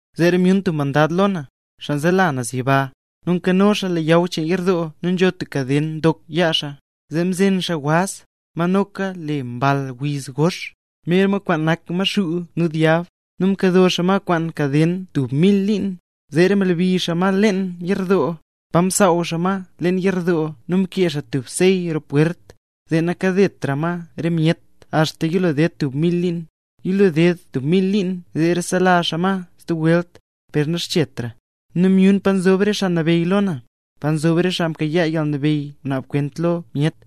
Zeera myun tub mandad lo na, xaa nzela naz yiba. Nu nkano xaa leyaw cheen yerdoo nu nzho tub kaden ndok yaa xaa. Zee mzen xaa waz, ma noka le Mball Wiz Gox, mer ma kwaan nak Maxuu nu Dyab, nu mkado xaa ma kwaan kaden tub mil liin. Zeera mlebi xaa ma leen yerdoo, pa msaaw xaa ma leen yerdoo nu mkee xaa tub sey roo pwert, zee nakadetra ma re myet axta yilo ded tub mil liin. Yilo ded tub mil liin zeera selaa xaa ma stub welt, per naxchetra. Nu myun pa nzob re xaa nabeyy lo na, pa nzob re xaa mkayaa yalnabeyy naab kwent lo myet.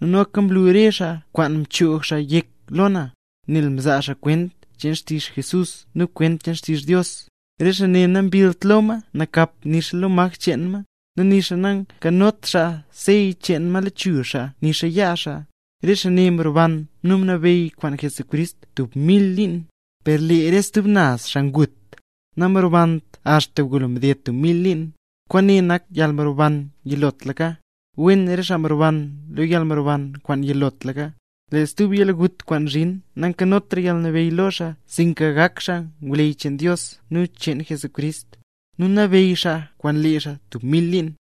Nu noka mlu re xaa kwaan mchoog xaa yek lo na, nel mzaa xaa kwent cheen xtizh Jesús nu kwent xtizh Dios. Re xaa ne nambillt lo ma nakap nixa lo maj cheen ma, nu nixa nankanot xaa sey cheen ma lechuzh xaa nixa yaa xaa. Re xaa ne mroban nu mnabeyy kwaan Jesucrist tub mil liin. Per lee re stub naz xaa ngut, namrobant axta ngulo mded tub mil liin. Kwaane nak yalmroban yilotlaka. ¡Wen re xaa mroban lo yalmroban kwaan yilotlaka! Lee stub yalgut kwaan zhin nankanotra yalnabeyy lo xaa sinka gak xaa ngwleyy cheen Dios nu cheen Jesucrist, nu nabeyy xaa kwaan lee xaa tub mil liin.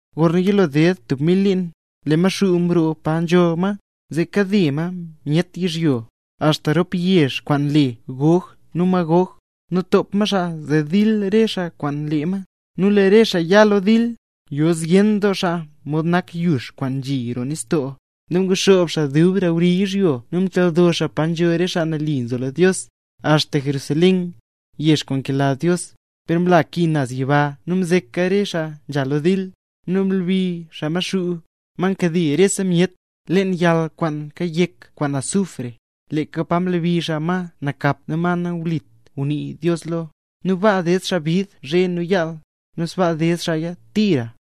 Gorna yilo ded tub mil liin, lee Maxuu roo paro nzho ma, zee kade ma re myet yizhyo, axta rop yezh kwaan le Gog nu Magog. Nu top ma xaa zee dil re xaa kwaan lee ma. Nu lee re xaa ya lo dil, yo zyen doo xaa mod nak yux kwaan nzhi roo nistoo. Nu nguxoob xaa dub roo wri yizhyo, nu mchaldo xaa pa nzho re xaa mle nambey Jesús, axta Jerusalén, yezh kwaan nkela Dios. Per mla ki naz yiba nu mzeka rese xaa nzha lo dil. Nu mlebi xaa Maxuu, ma nkade rese myet, leen yal kwaan kayek kwaan azufre, leeka pa mlebi xaa ma nakap nu ma nawlit ngunii Dios lo. Nu baa ded xaa bid zhe nu yaal, nu sbaa ded xaaya tira.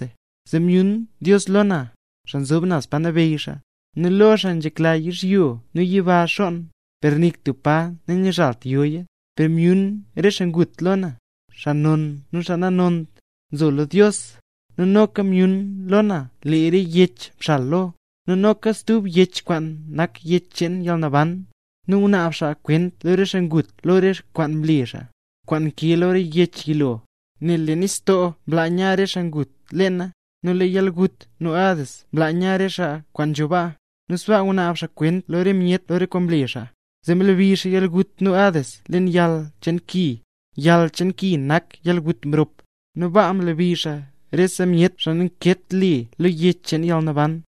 Zee myun Dios lo na, xaa nzob naz pa nabeyy xaa. Nu lo xaa nzhekla yizhyo nu yiba xonn, per nik tub pa nanguzhalt yoya. Nu myun re xaa ngut lo na, xaa non nu xaa nanont, nzo lo Dios; nu noka myun lo na lee re yech mxal lo. Nu noka stub yech kwaan nak Yech cheen Yalnaban. Nu mnaab xaa kwent lo re xaa ngut lo re kwaan mle xaa, kwaan nkee lo re yech yilo. Nel lee nistoo mlaa nya re xaa kwaan ngut leena, nu lee yalgut nu Hades mlaa nya re xaa kwaan nzho baa, nu sbaa ngunaab xaa kwent lo rese myet lo re kwaan mle xaa. Zee mlebi xaa yalgut nu Hades leen yal cheen ki. Yal cheen ki nak yalgut mrop, nu baa mlebi xaa rese myet kwaan nankeet le lo Yech cheen Yalnaban.